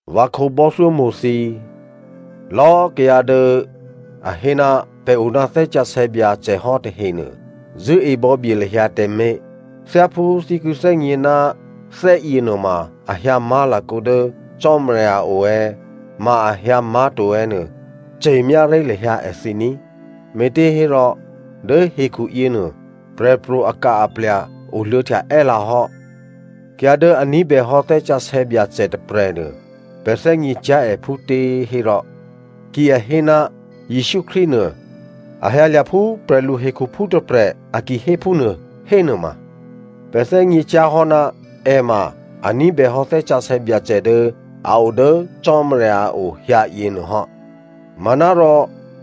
Vǎ khǒbò́thyómo̤ thǐ꤮, lò̌꤮ kayǎ dố a hé ná pè̤ o ná Thè́ Sǎsè̌ Byacè hò́ tahenuô, zṳ̂́e bò̌bye lahyǎ tǎmé̤. Thyáphú thǐ ki thè́gně ná thè́yě nuôma a hyǎ má̤lakǒ dố Cò́marya a o è̌, ma a hyǎ má̤to è̌ nuô ce̤myá ré̤ lahyǎ èthǐ ní꤮, me̤těhérò dố hekhuyěnuô, prè̤pro̤ aka-aplya̤ oluô̌htya è́lǎ hò́. Kayǎ dố a ní̤bèhò́ Thè́ Sǎsè̌ Byacè tôprè̤nuô, pè̤ thè́gně cyá̤ è phútěhérò, ki a hé ná Jesǔ Krístu nuô, a hyǎlya̤ phú prè̤lu hekhuphú tôprè̤ a ki hé phúnuô hénuôma, pè̤ thè́gně cyá̤ hò́ ná è ma a ní̤bèhò́ Thè́ Sǎsè̌ Byacè dố a o dố Cò́marya a o hyǎ yěnuô hò́. Manárò,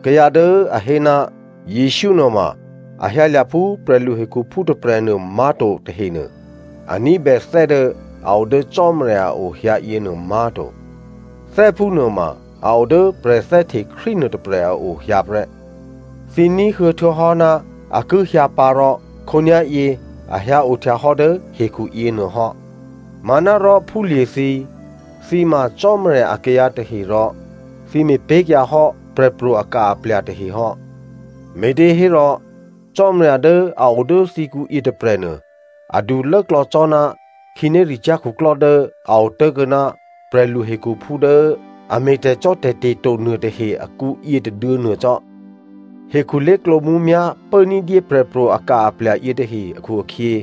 kayǎ dố a hé ná Jesǔ nuôma a hyǎlya̤ phú prè̤lu hekhuphú tôprè̤nuô má̤to tahenuô, a ní̤bè thè́ dố a o dố Cò́marya a o hyǎ yěnuô má̤to. Thè́ phúnuô ma a o dố prè̤thè́hte Krístu nuôtôprè̤ a o hyǎ prè́. Thǐ ní̤huô̌ htuô̌hò́ ná a ki hyǎ pǎ, rò khǒnyá̤yě a hyǎ ohtya hò́ dố hekhuyěnuô hò́. Manárò phúlye̤ thǐ꤮, thǐ ma Cò́marya akayǎ tahe rò thǐ me̤pé̤kyǎ hò́ prè̤pro̤ aka-aplya̤ tahe hò́, me̤těhérò Cò́marya dố a o dố thǐkǔ yětôprè̤nuô adu lốklò̌ cò́ ná khǐnéricyá̤ khuklò́ dố a otố̤kuô̌ ná prè̤luhekhuphú dố a me̤ tè̤cò́tè̤te̤ to nuôtahe akǔ yětôduô̌ nuô cò́. Hekhu lé̤klǒ mǔmyá̤ pố ní̤dyé prè̤pro̤ aka-aplya̤ yětahe akhu-akhyě,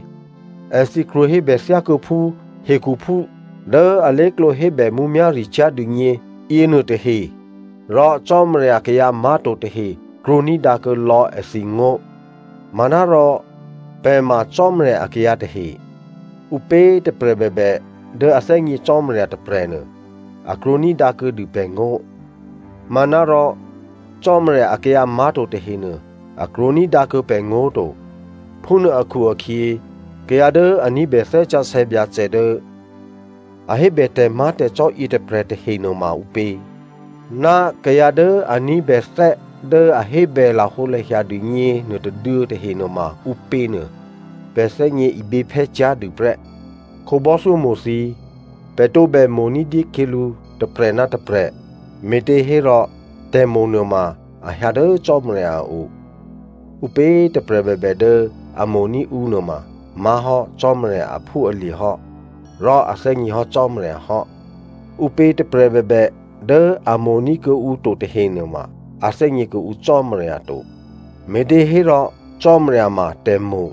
èthǐ krwǒ hébè thyákuô̌phú hekhuphú dố alé̤klǒ hébè mǔmyá̤ricyá̤ dûgně yěnuôtahe rò Cò́marya akayǎ má̤to tahe krwǒ ní̤dǎkuô̌ lò̌ èthǐngó̤. Manárò pè̤ ma Cò́marya akayǎ tahe. Ǔpě꤮ tôprè̤ bèbè dố a thè́gně Cò́marya tôprè̤nuô, a krwǒní̤dǎ kuô̌dû pè̤ngó̤. Manárò Cò́marya akayǎ má̤to tahenuô, a krwǒ ní̤dǎ kuô̌ pè̤ngó̤ to. Phúnuô akhu-akhyě kayǎ dố a ní̤bè Thè́ Sǎsè̌ Byacè dố a hébè tè̤má̤tè̤cò́ yětôprè̤ tahe nuôma ǔpě, ná kayǎ dố a ní̤bè thè́ dố a hébè lahǒlahya dûgně nuôtôduô̌ tahe nuôma ǔpěnuô, pè̤ thè́gně iběphè́ cyá̤ dû prè́. Khǒbò́thyómo̤ thǐ꤮, pè̤ tǒbè mo̤ ní̤dyé khyělǔ tôprè̤ ná tôprè̤, me̤těhérò tè̤mo̤nuô ma a hyǎ dố Cò́marya a o. Ǔpě꤮ tôprè̤ bèbè dố a mo̤ní̤ ǔ nuôma má̤hò́ Cò́marya aphúalye̤ hò́, rò a thè́gněhò́ Cò́marya hò́. Ǔpě꤮ tôprè̤ bèbè dố a mo̤ní̤ kuô̌ǔ to tahenuôma, a thè́gně kuô̌ǔ Cò́marya to, me̤těhérò Cò́marya ma tè̤mo̤.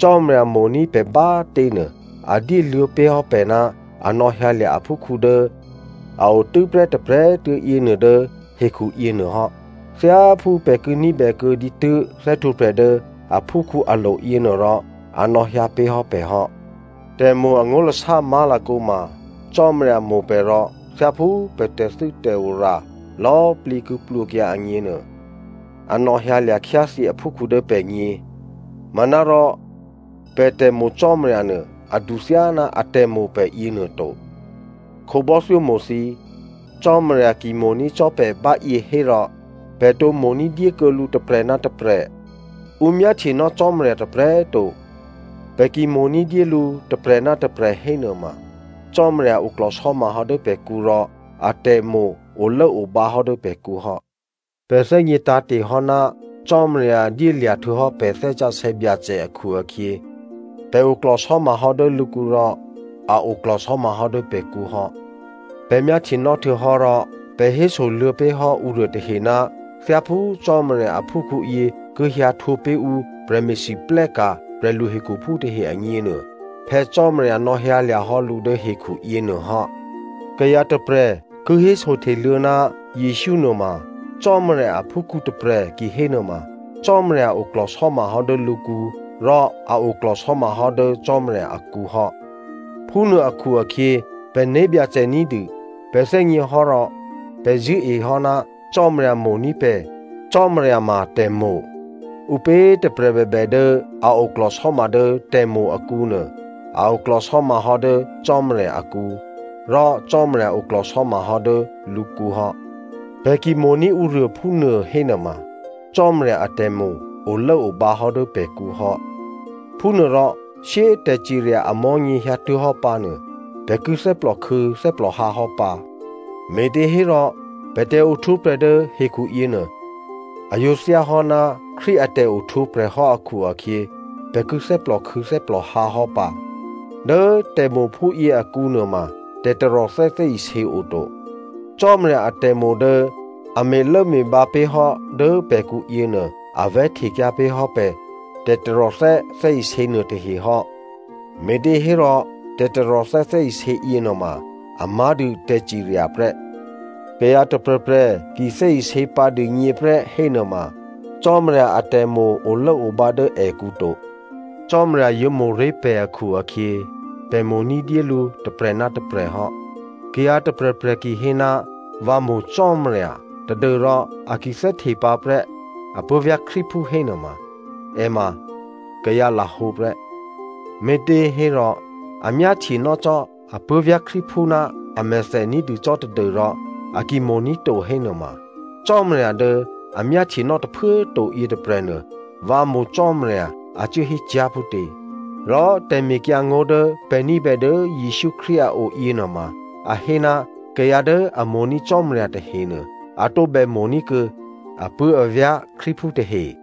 Cò́marya mo̤ní̤ pè̤ bá꤮ těnuô a dyéluô̌ pé̤ hò́ pè̤ ná a nò̌hyǎlya̤ aphúkhǔ dố a o tû́ prè́ tôprè̤꤮ tuô̌ yěnuô dố hekhu yěnuô hò́. Thyáphú pè̤ ki ní̤bè kuô̌ dǐtû́ thè́htwǒprè̤ dố aphúkhǔ alo̤ yěnuô rò, a nò̌hyǎ pé̤ hò́ pè̤ hò́. Tè̤mo̤ angó̤lasá má̤lakǒ ma Cò́marya mo̤ pè̤ rò thyáphú pè̤ tè̤thû́tè̤ora lò̌꤮ plǐ ki plwǒkyǎ agněnuô, a nò̌hyǎlya̤ khyáthyě aphúkhǔ dố pè̤gně. Manárò pè̤ tè̤mo̤ Cò́marya nuô adu thyáná atè̤mo̤ pè̤ yěnuô to. Khǒbò́thyómo̤ thǐ꤮, Cò́marya ki mo̤ní̤ cò́ pè̤ báyě hérò, pè̤ tǒ mo̤ ní̤dyé kuô̌ lǔ tôprè̤ ná tôprè̤. Ǔ myáhtyenò́ Cò́marya tôprè̤꤮ to. Pè̤ ki mo̤ ní̤dyé lǔ tôprè̤ ná tôprè̤ hénuôma, Cò́marya oklò̤sò́ma hò́ dố pè̤kǔ rò atè̤mo̤ olốobǎ hò́ dố pè̤kǔ hò́. Pè̤ thè́gně tǎ̤te̤hò́ ná Cò́marya dyélya̤ htuô̌hò́ pè̤ Thè́ Sǎsè̌ Byacè akhu-akhyě pè̤ oklò̤sò́ma hò́ dố lǔkǔ rò a oklò̤sò́ma hò́ dố pè̤kǔ hò́. Pè̤ myáhtyenò́ htuô̌hò́, rò pè̤ hésoluô̌ pé̤ hò́ ǔruô tahe ná thyáphú Cò́marya aphúkhǔyě ki hyǎ htwǒpé̤ ǔ prè̤me̤lwóhteka̤ prè̤lu hekhuphú tahe agněnuô, Phè̌ Cò́marya nò̌hyǎlya̤hò́ lǔ dố hekhu yěnuô hò́. Kayǎ tôprè̤ ki hésohteluô̌ ná Jesǔ nuôma Cò́marya aphúkhǔ tôprè̤ kihénuôma Cò́marya oklò̤sò́ma hò́ dố lǔkǔ rò a oklò̤sò́ma hò́ dố Cò́marya akǔ hò́. Phúnuô akhu-akhyě pè̤ né̤byacè ní̤dû pè̤ thè́gněhò́, rò pè̤ zṳ̂́ehò́ ná Cò́marya mo̤ní̤ pè̤. Cò́marya ma tè̤mo̤. Ǔpě꤮ tôprè̤ bèbè dố a oklò̤sò́ma dố tè̤mo̤ akǔnuô, a oklò̤sò́ma hò́ dố Cò́marya akǔ rò Cò́marya oklò̤sò́ma hò́ dố lǔkǔ hò́. Pè̤ ki mo̤ní̤ ǔruô phúnuô hénuôma, Cò́marya atè̤mo̤ olốobǎ hò́ dố pè̤kǔ hò́. Phúnuôrò shyé꤮ tè̤cirya amò̤́nyě hyǎtuố̤hò́ pǎnuô, pè̤ ki thè́plòkhû̌ thè́plòhǎ hò́ pǎ, me̤těhérò pè̤ tè̤ohtwǒprè̤ dố hekhuyě nuô, a yǒ thyáhò́ ná Krístu a tè̤ohtwǒprè̤ hò́ akhu-akhyě, pè̤ ki thè́plòkhû̌ thè́plòhǎ hò́ pǎ. Dố tè̤mo̤ phúyě akǔ nuôma tè̤taròthè́ thè́isě oto. Cò́marya atè̤mo̤ dố a me̤lốme̤bǎ pé̤ hò́ dố pè̤kǔ yěnuô a vè̤́htekyǎ pé̤ hò́ pè̤ tè̤taròthè́ thè́isě nuôtahe hò́, me̤těhérò tè̤taròthè́ thè́isě yěnuôma a má̤dû tè̤cirya prè́. Kayǎ tôprè̤prè̤ ki thè́isě pǎ dûgně prè́ hénuôma, Cò́marya atè̤mo̤ olốobǎ dố èkǔ to. Cò́marya yǒ mo̤ré̤ pè̤ akhu-akhyě pè̤ mo̤ ní̤dyé lǔ tôprè̤ ná tôprè̤ hò́. Kayǎ tôprè̤prè̤ ki hé, “Vǎ mo̤ Cò́marya,” tadû́rò a ki thè́hte pǎprè́ apuố̤vyá̤ Krístuphú hénuôma, è ma kayǎ lahǒ prè́, me̤těhérò a myáhtyenò́ cò́ apuố̤vyá̤ Krístuphú ná amèthè ní̤dû cò́ tadû́rò a ki mo̤ní̤ to hénuôma, Cò́marya dố a myáhtyenò́ tôphuố꤮ to, yětôprè̤nuô “Vǎ mo̤ Cò́marya,” a cuố hécyá̤ phútě? Rò tè̤mekyǎngó̤ dố pè̤ ní̤bè dố Jesǔ Krístu a o yěnuôma a hé ná kayǎ dố a mo̤ní̤ Cò́marya tahenuô, a tǒbè mo̤ní̤ kuô̌ apuố̤avyá̤ Krístuphú tahe.